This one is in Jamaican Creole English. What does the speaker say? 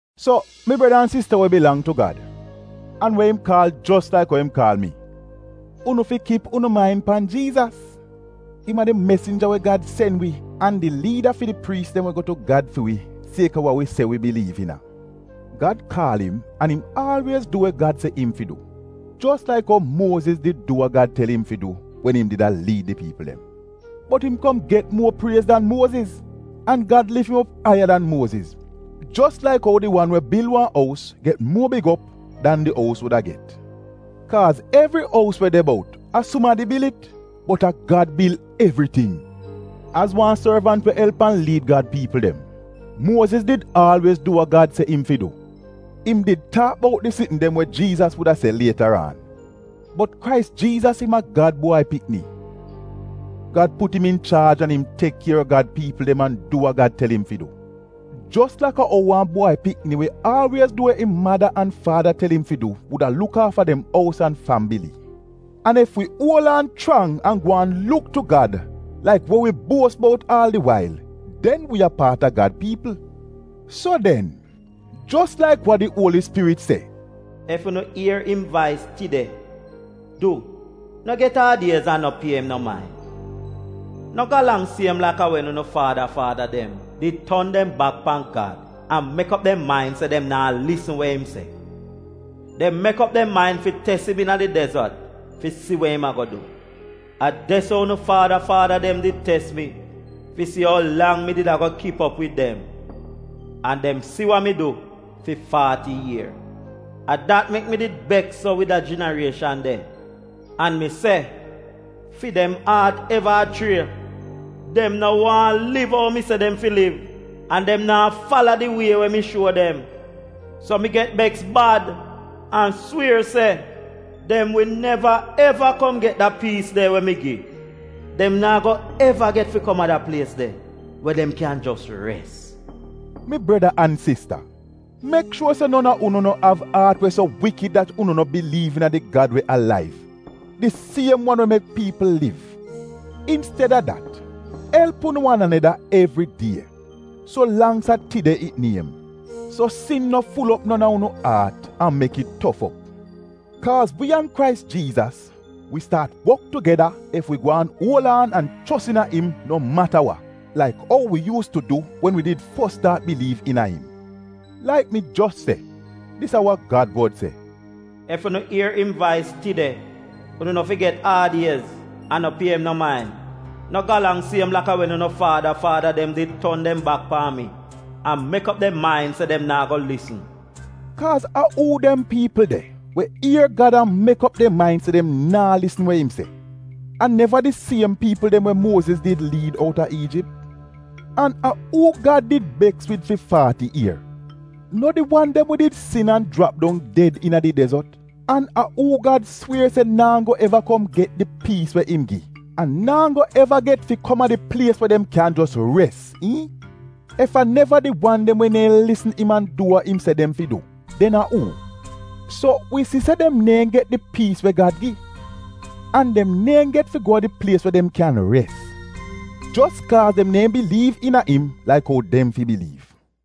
So mi breda an sista we bilang tu Gad, an we im kaal jos laik ou im kaal mi, unu fi kip unu main pan Jiizas. Im a di mesinja we Gad sen wi, an di liida fi di priis dem we go tu Gad fi wi sieka wa wi se wi biliiv iina. Gad kaal im an im aalwiez du we Gad se im fi du, jos laik ou Muoziz did du wa Gad tel im fi du wen im did a liid di piipl dem. Bot im kom get muo priez dan Muoziz an Gad lif im op aiya dan Muoziz, jos laik ou di wan we bil wan ous get muo big op dan di ous wuda get. Kaaz evri ous we de bout, a sumadi bil it, bot a Gad bil evriting. Az wan sorvant we elp an liid Gad piipl dem, Muoziz did du wa Gad se im fi du. Im did taak bout di sitn dem we Jiizas wuda se lietaraan. Bot Krais Jiizas, im a Gad Bwai Pikni. Gad put im inchaaj an im tek kier a Gad piipl dem an du wa Gad tel im fi du, jos laka ou wan bwai pikni we aalwiez du we im mada an faada tel im fi du wuda luk aafa dem ous an fambili. An ef wi uol aan chrang an gwaan luk tu Gad laik wi buos bout aal di wail, den wi a paat a Gad piipl. So den, jos laik wa di Uoli Spirit se, “Ef unu ier im vais tide, du, no get aad-iez an no pie im no main. No galang siem laka wen unu faada faada dem did ton dem bak pan Gad an mek op dem main se dem naa lisn we im se. Dem mek op dem main fi tes im iina di dezot fi si we im ago du. A de-so unu faada faada dem did tes mi fi si ou lang mi did ago kip op wid dem, an dem si wa mi du fi faati ier A dat mek mi did beks so wid da jinarieshan de, an mi se, ‘Fi dem aat eva a chrie, dem no waahn liv ou mi se dem fi liv an dem naa fala di wie we mi shuo dem.’ So mi get beks bad an swier se, ‘Dem wi neva eva kom get da piis de we mi gi; dem naa go eva get fi kom a da plies de we dem kyan jos res!’” Mi breda an sista, mek shuor se non a unu no av aat we so wikid dat unu no biliiv iina di Gad we alaiv — di siem wan we mek piipl liv. Insteda dat elp unu wan aneda evri die, so langks az a ‘Tide’ it niem, so sin no ful op non a unu aat, an mek it tof op. Kaaz wi an Krais Jiizas wi staat wok tugeda, ef wi gwaan uol aan an chos iina im no mata wa, laik ou wi yuus tu du it wen wi did fos staat biliiv iina im. Laik mi jos se, dis a wa Gad wod se, ‘Ef unu ier im vais tide, Unu no fi get aad-iez an no pie im no main No galang siem laka wen unu faada faada dem did ton dem bak pan mi an mek op dem main se dem naa go lisn. Kaaz a uu dem piipl de we ier Gad an mek op dem main se dem naa lisn we im se? A neva di siem piipl dem we Muoziz did liid outa Iijip? An a uu Gad did beks wid fi faati ier? No di wan dem we did sin an jrap dong ded iina di dezot? An a uu Gad swier se naa go eva kom get di piis we im gi, an naa go eva get fi kom a di plies de we dem kyan jos res, iihn? Ef a neva di wan dem we neehn lisn im an du wa im se dem fi du, den a uu? So wi si se dem neehn get di piis we Gad gi, an dem neehn get fi go a di plies we dem kyan res, jos kaaz dem neehn biliiv iina im laik ou dem fi biliiv.